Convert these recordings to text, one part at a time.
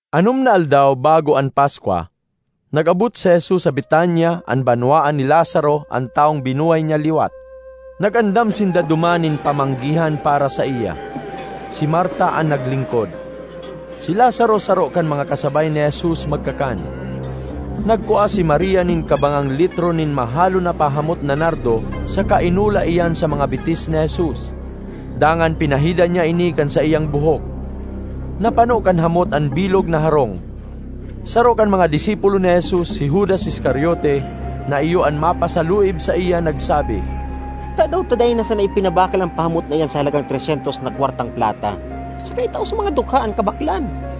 Anom na aldaw bago an Paskwa, nag-abot si Jesus sa Betania, an banwaan ni Lazaro, an tawong binuhay niya liwat. Nag-andam sinda duman nin pamanggihan para saiya. Si Marta an naglingkod; si Lazaro saro kan mga kasabay ni Jesus magkakan. Nagkua si Maria nin kabangang litro nin mahalon na pahamot na nardo saka inula iyan sa mga bitis ni Jesus. Dangan pinahidan niya ini kan saiyang buhok. Napano kan hamot an bilog na harong. Saro kan mga disipulo ni Jesus, si Judas Iscariote na iyo an mapasaluib saiya, nagsabi, ”Tadaw ta dai na sana ipinabakal an pahamot na iyan sa halagang tres syentos na kwartang plata, saka itao sa mga dukha an kabaklan?”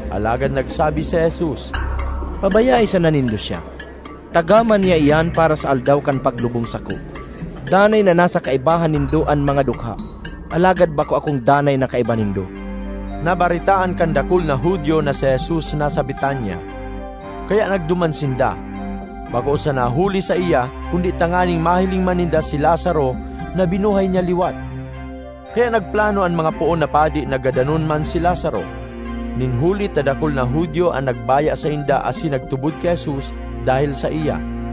Alagad nagsabi si Jesus, “Pabayae sana nindo siya! Tagama niya iyan para sa aldaw kan paglubong sako. Danay na nasa kaibahan nindo an mga dukha, alagad bako akong danay na kaiba nindo.” Nabaretaan kan dakul na Judio na si Jesus nasa Betania, kaya nagduman sinda, bako sana huli saiya, kundi tanganing mahiling man ninda si Lazaro na binuhay niya liwat. Kaya nagplano an mga poon na padi na gadanon man si Lazaro, nin huli ta dakul na Judio an nagbaya sainda asin nagtubod ki Jesus dahel saiya.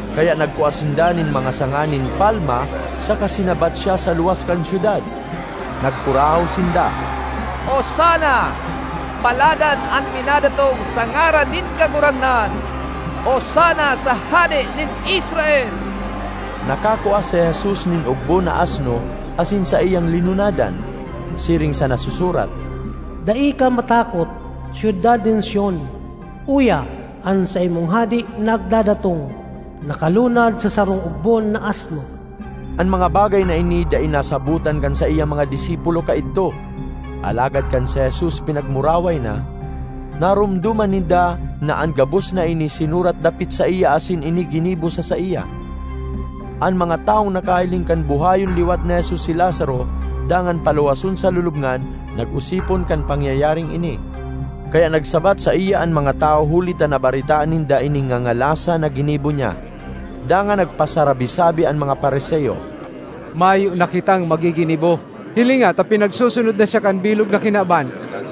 Kaya nagkua sinda nin mga sanga nin palma saka sinabat siya sa luwas kan syudad. Nagkurahaw sinda, “Osana! Paladan an minadatong sa ngaran nin Kagurangnan! Osana sa Hade nin Israel!” Nakakua si Jesus nin ogbon na asno asin saiyang linunadan; siring sa nasusurat, ”Dai ka matakot, syudad nin Sion! Uya, an saimong hade nagdadatong, nakalunad sa sarong ogbon na asno!” An mga bagay na ini dai nasabotan kan saiyang mga disipulo kaidto; alagad kan si Jesus pinagmuraway na, naromdoman ninda na an gabos na ini sinurat dapit saiya asin ini ginibo sa saiya. An mga tawong nakahiling kan buhayon liwat ni Jesus si Lazaro dangan paluwason sa lulubngan, nag-osipon kan pangyayaring ini. Kaya nagsabat saiya an mga tawo huli ta nabaretaan ninda ining ngangalasan na ginibo niya. Dangan nagpasarabi-sabi an mga Fariseo, “Mayo na kitang magiginibo! Hilinga ta pinagsusunod na siya kan bilog na kinaban!”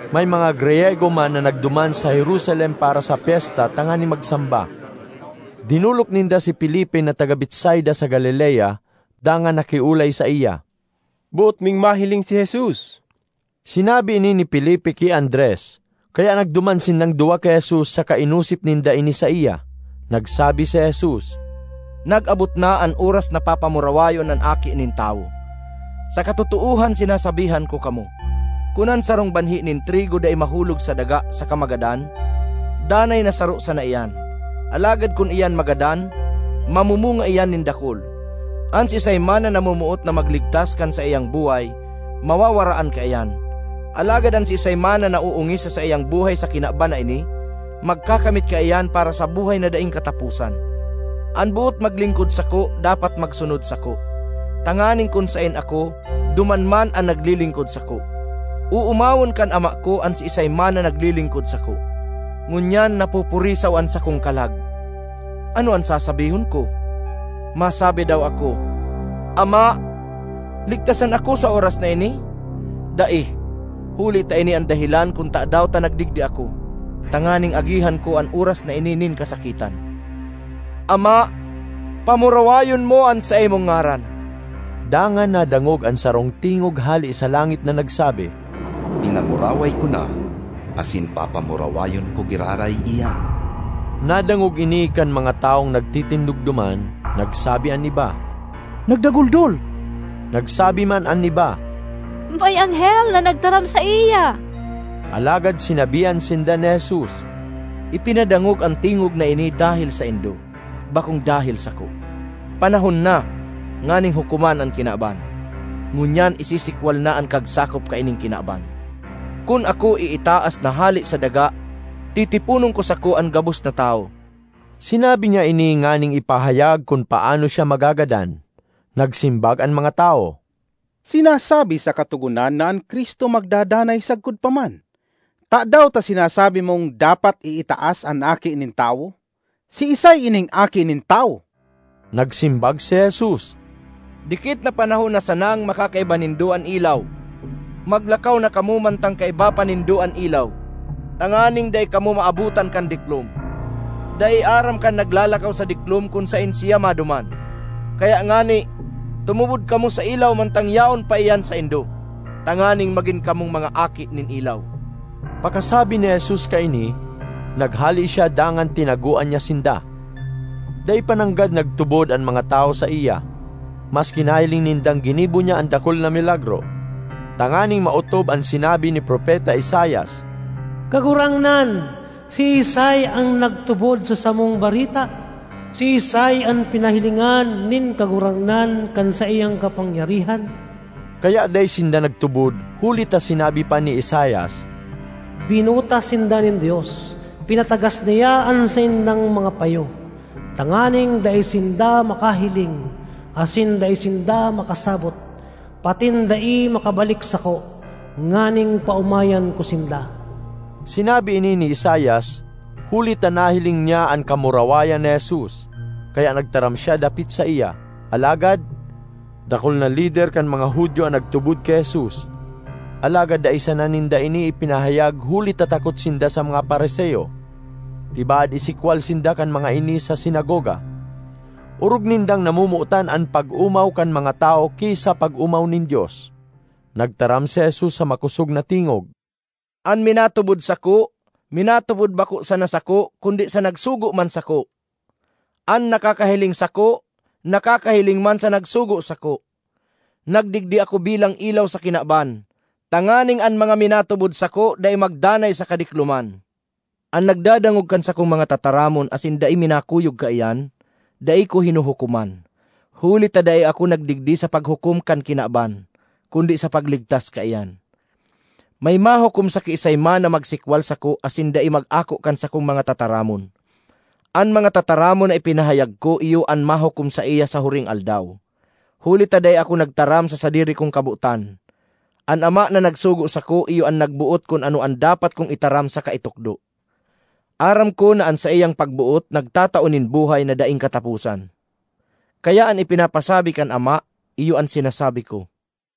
May mga Griyego man na nagduman sa Jerusalem para sa pyesta tanganing magsamba. Dinolok ninda si Felipe na taga Betsaida sa Galilea, dangan nakiolay saiya, “Boot ming mahiling si Jesus.” Sinabi ini ni Felipe ki Andres, kaya nagduman sindang duwa ki Jesus saka inosip ninda ini saiya. Nagsabi si Jesus, “Nag-abot na an oras na papamurawayon an Aki nin Tawo. Sa katotoohan sinasabihan ko kamo, kun an sarong banhi nin trigo dai mahulog sa daga saka magadan, danay na saro sana iyan. Alagad kun iyan magadan, mamumunga iyan nin dakul. An siisay man na namomoot na magligtas kan saiyang buhay, mawawaraan kaiyan; alagad an siisay man na naoongis sa saiyang buhay sa kinaban na ini, magkakamit kaiyan para sa buhay na daing kataposan. An boot maglingkod sako dapat magsunod sako, tanganing kun saen ako, duman man an naglilingkod sako. Oomawon kan Ama ko an siisay man na naglilingkod sako.” ”Ngunyan napupurisaw an sakong kalag. Ano an sasabihon ko? Masabi daw ako, ‘Ama, ligtasan ako sa oras na ini’? Dai! Huli ta ini an dahelan kun tadaw ta nagdigdi ako—tanganing agihan ko an oras na ini nin kasakitan. Ama, pamurawayon mo an saimong ngaran!” Dangan nadangog an sarong tingog hale sa langit na nagsabi, “Pinamuraway ko na asin papamurawayon ko giraray iyan.” Nadangog ini kan mga tawong nagtitindog duman. Nagsabi an iba, “Nagdaguldol!” Nagsabi man an iba, “May anghel na nagtaram saiya!” Alagad sinabihan sinda ni Jesus, “Ipinadangog an tingog na ini dahel saindo, bakong dahel sako. Panahon na nganing hukoman an kinaban. Ngunyan isisikwal na an kagsakop kaining kinaban. Kun ako iitaas na hale sa daga, titiponon ko sa sako an gabos na tawo.” (Sinabi niya ini nganing ipahayag kun paano siya magagadan.) Nagsimbag an mga tawo, “Sinasabi sa Katogonan na an Cristo magdadanay sagkod pa man. Tadaw ta sinasabi mong dapat iitaas an Aki nin Tawo? Siisay ining Aki nin Tawo?” Nagsimbag si Jesus, “Dikit na panahon na sanang makakaiba nindo an ilaw. Maglakaw na kamo mantang kaiba pa ninda (nindo) an ilaw, tanganing dai kamo maabotan kan diklom. Dai aram kan naglalakaw sa diklom kun saen siya maduman. Kaya ngani, tumubod kamo sa ilaw mantang yaon pa iyan saindo, tanganing magin kamong mga aki nin ilaw.” Pakasabi ni Jesus kaini, naghale siya dangan tinagoan niya sinda. Dai pa nanggad nagtubod an mga tawo saiya, maski nahiling nindang ginibo niya an dakul na milagro, tanganing maotob an sinabi ni Propeta Isaias, “Kagurangnan, siisay an nagtubod sa samong bareta? Siisay an pinahilingan nin Kagurangnan kan saiyang kapangyarihan?” Kaya dai sinda nagtubod huli ta sinabi pa ni Isaias, ”Binuta sinda nin Dios, pinatagas niya an saindang mga payo, tanganing dai sinda makahiling, asin dai sinda makasabot, patin dai makabalik sako, nganing paomayan ko sinda.” Sinabi ini ni Isaias huli ta nahiling niya an kamurawayan ni Jesus, kaya nagtaram siya dapit saiya. Alagad, dakul na lider kan mga Judio an nagtubod ki Jesus; alagad dai sana ninda ini ipinahayag huli ta takot sinda sa mga Fariseo—tibaad isikwal sinda kan mga ini sa sinagoga. Orog nindang namomotan an pag-omaw kan mga tawo ki sa pag-omaw nin Dios. Nagtaram si Jesus sa makosog na tingog, “An minatubod sako, minatubod bako sana sako kundi sa nagsugo man sako. An nakakahiling sako, nakakahiling man sa nagsugo sako. Nagdigdi ako bilang ilaw sa kinaban, tanganing an mga minatubod sako dai magdanay sa kadikloman. An nagdadangog kan sakong mga tataramon asin dai minakuyog kaiyan, dai ko hinuhukoman. Huli ta dai ako nagdigdi sa paghukom kan kinaban, kundi sa pagligtas kaiyan. May mahukom sa kiisay man na magsikwal sako asin dai mag-ako kan sakong mga tataramon: an mga tataramon na ipinahayag ko iyo an mahukom saiya sa huring aldaw! Huli ta dai ako nagtaram sa sadiri kong kabotan; an Ama na nagsugo sako iyo an nagboot kun ano an dapat kong itaram saka itukdo. Aram ko na an saiyang pagboot nagtatao nin buhay na daing kataposan. Kaya an ipinapasabi kan Ama, iyo an sinasabi ko.”